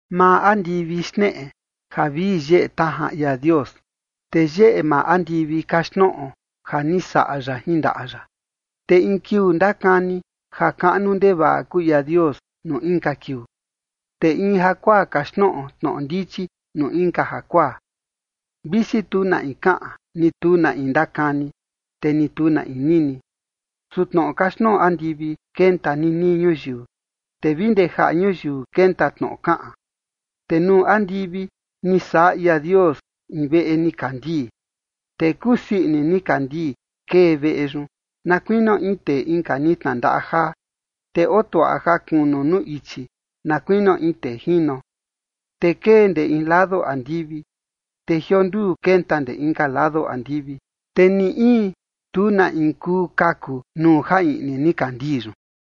Maa andivi xneꞌe ja vii yeꞌe tajan ia Dios, te yeꞌe maa andivi kaxtnoꞌo ja ni saꞌa ya jin ndaꞌa ya. Te in kiuu ndakani ja kaꞌnu ndevaꞌa kuu ia Dios nuu inka kiuu, te in jakuaa kaxtnoꞌo tnoꞌo ndichi nuu inka jakuaa. Visi tu na in kaꞌan, ni tu na in ndakani, te ni tu na in nini, su tnoꞌo kaxtnoꞌo andivi kenta ninii ñuyiu, te vi ndee jaꞌa ñuyiu kenta tnoꞌo kaꞌan. Te nuu andivi ni saꞌa ia Dios in veꞌe nikandii, te kusii ini nikandii kee veꞌe yun, na kuinio in tee inka ni tnandaꞌa jaa, te otuaꞌa ja kunu nuu ichi na kuinio in tee jino. Te kee ndee in lado andivi, te jionduu kenta ndee inka lado andivi. Te ni in, tu na in kuu kaku nuu ja iꞌni nikandii yun.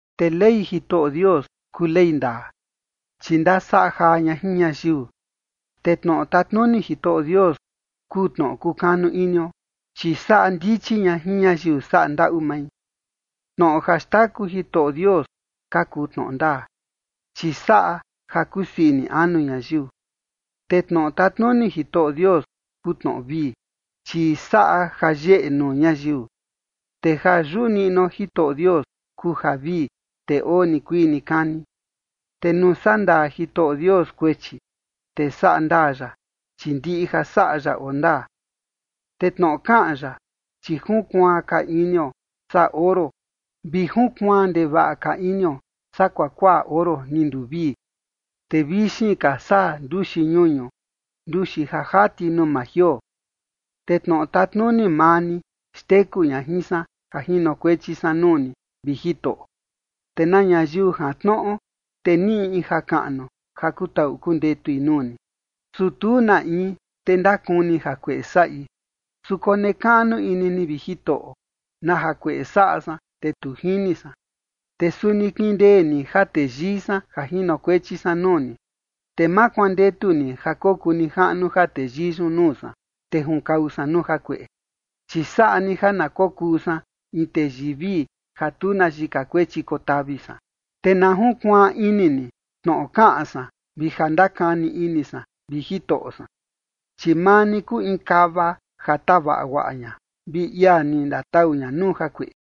Te ley Jitoꞌo Dios kuu ley ndaa, chi ndasaꞌa jaa ña jin ñayiu. Te tnoꞌo tatnuni Jitoꞌo Dios kuu tnoꞌo kukanu inio, chi saꞌa ndichi ña jin ñayiu saꞌa ndaꞌu mai. Tnoꞌo ja xtaku Jitoꞌo Dios ka kuu tnoꞌo ndaa, chi saꞌa ja kusii ini anu ñayiu. Te tnoꞌo tatnuni Jitoꞌo Dios kuu tnoꞌo vii, chi saꞌa ja yeꞌe nuu ñayiu. Te ja yuꞌu niꞌnuo Jitoꞌo Dios kuu javii, te oo nikuii nikani. Te nuu sandaa Jitoꞌo Dios kuechi, te saꞌa ndaa ya, chi ndiꞌi ja saꞌa ya oo ndaa. Te tnoꞌo kaꞌan ya, chi junkuaan ka inio saa oro, vi junkuaan ndevaꞌa ka inio saa kuakuaꞌa oro ni nduvii, te vixin ka saa nduxi ñuñu, nduxi ja jati nuu maa jioo. Te tnoꞌo tatnuni maa ni xteku ña jin san ja jinokuechi san nuu ni, vi Jitoꞌo, te na ñayiu jantnoꞌo, te niꞌi in jakaꞌnu ja kutaꞌu kundetui nuu ni. Su tu na in, te ndakuni jakueꞌe saꞌi, su konekaꞌnu ini ni, vi Jitoꞌo, na jakueꞌe saꞌa san, te tu jini san. Te suni kindee ni ja teyii san ja jinokuechi san nuu ni, te ma kuandetu ni ja kokuu nijaꞌnu ja teyii yun nuu san, te junkau san nuu jakueꞌe. Chi saꞌa ni ja na kokuu san in teyii vii, ja tu na yika kuechi kotavi san. Te na junkuaan ini ni tnoꞌo kaꞌan san vi ja ndakani ini san, vi Jitoꞌo san, chi maa ni kuu in kava ja tavaꞌa guaꞌa ña, vi ia ni ndatau ña nuu jakueꞌe.